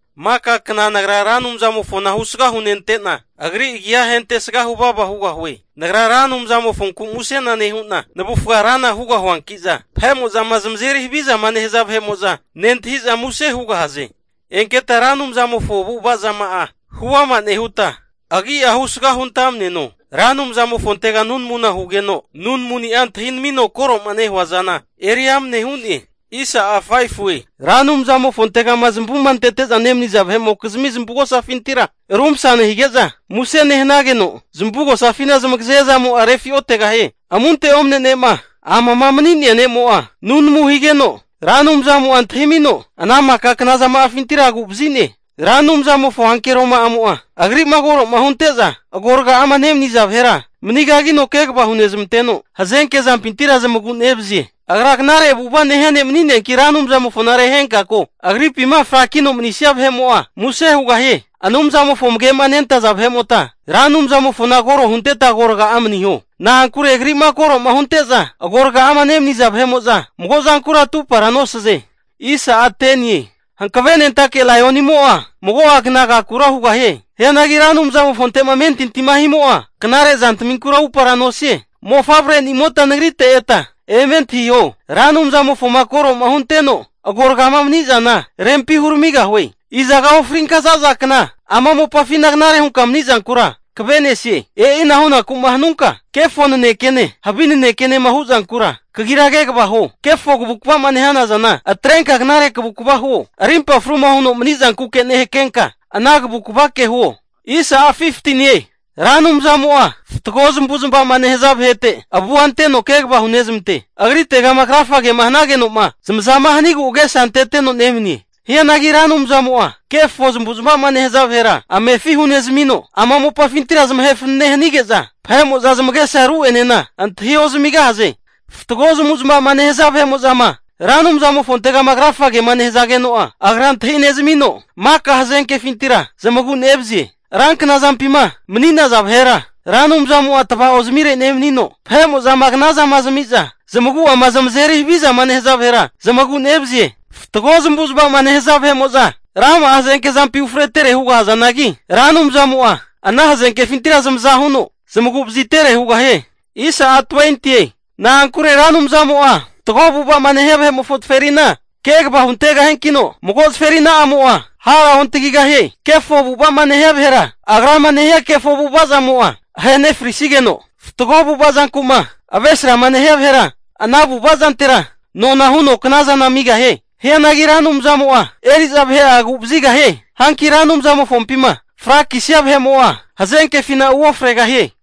Maka kna nagra Ra Anumzamofona husga hunente'na, Agri agi'a hentesga huvava hugahue. Nagra Ra Anumzamofonku musena nehu'na navufga rana hugahuanki'za, vahe'mo'zama zamazeri havizama nehaza vahe'mo'za nentahi'za muse hugahaze. Enketa Ra Anumzamofo avu'avazama'a huama nehuta, agi'a husga huntamneno. Ra Anumzamofontega nunamuna hugeno, nunamuni'a antahinamino koro'ma nehua zana eri amne hu'ne. Ra Anumzamofontegama zamavuma antete'za nemaniza vahe'mokizmi zamavugosafintira rumasa nehanige'za, muse nehanageno zamavugosafina zamagaze zamo'a refi'otegahie. Amunte omne ne'ma amama mani'nea ne'mo'a nunamu higeno, Ra Anumzamo'a antahimino ana maka knazama'afintira agu'vazi'ne. Ra Anumzamofo ankeroma'amo'a Agri'ma koro'ma hunte'za agoraga'ama nemaniza vahera manigagino kegava hunezmanteno hazenke zampintira zamagu'nevazie. Agra knare avu'ava nehia ne' mani'neanki Ra Anumzamofona rehenka ko, Agripinkama frakino manisia vahe'mo'a muse hugahie. Anumzamofo amage'ma nentaza vahe'mota Ra Anumzamofona koro hunteta agoraga'a maniho. Na'ankure Agri'ma koro'ma hunte'za agoraga'ama nemaniza vahe'mo'za mago zankura atupara nosaze. Hankavenentake laionimo'a mago'a kna agakura hugahie. Hianagi Ra Anumzamofonte'ma amentintima himo'a, knare zantaminkura upara nosie. Mofavrenimota nagrite eta eme antahiho. Ra Anumzamofoma koroma hunteno agoraga'ama mani'zana rempi huramigahue. Izaga ofrinka zaza kna ama mopafina knare hunka manizankura kave'nesie? E'ina hunaku'ma hanunka, kefo nanekene havi nanekema hu'zankura, kagira kegava huo. Kefo kavukava'ma nehanazana atrenka knare kavukva huo. Arimpa fruma huno mani zankuke nehakenka, ana kavukavake huo. Ra Anumzamo'a fatgo zamavu'zamavama nehaza vahete avua anteno kegava hunezmante. Agritegama krafagema hanageno'ma zamaza hanigu agesa anteteno nemanie. Hianagi Ra Anumzamo'a kefo zamavu'zmava'ma nehaza vahera amefi hunezmino, ama mopafintira zamahe fanane hanige'za vahe'mo'za zamagesa ru'enena antahi ozamigahaze. Fatgo zamavu'zmava'ma nehaza vahe'mo'zama Ra Anumzamofontegama krafagema nehazageno'a, Agra antahi nezmino maka hazenkefintira zamagu'nevazie. Ranknazampima mani'naza vahera Ra Anumzamo'a tva'ozmire nemanino, vahe'mo'zama knazama zami'za zamagu'ama zamazeri havizama nehaza vahera, zamagu'nevazie. Fatgo zamavu'zmava'ma nehaza vahe'mo'za rama'a hazenkefi ufretere hugahazanagi, Ra Anumzamo'a ana hazenkefintira zamaza huno zmagu'vazitere hugahie. Na'ankure Ra Anumzamo'a fatgo avu'ava'ma nehia vahe'mofo zaferina kegava huntegahiankino mago zaferina'amo'a hara ontagigahie. Kefo avu'ava'ma nehia vahera agrama nehania kefo avu'ava zamo'a ahenefrisigeno, fatgo avu'ava zanku'ma avresrama nehania vahera, ana avu'ava'zantera nona huno knazana amigahie. Hianagi Ra Anumzamo'a eri'za vahe'a agu'vazigahie. Hanki Ra Anumzamofompima frakisia vahe'mo'a hazenkefina uofregahie.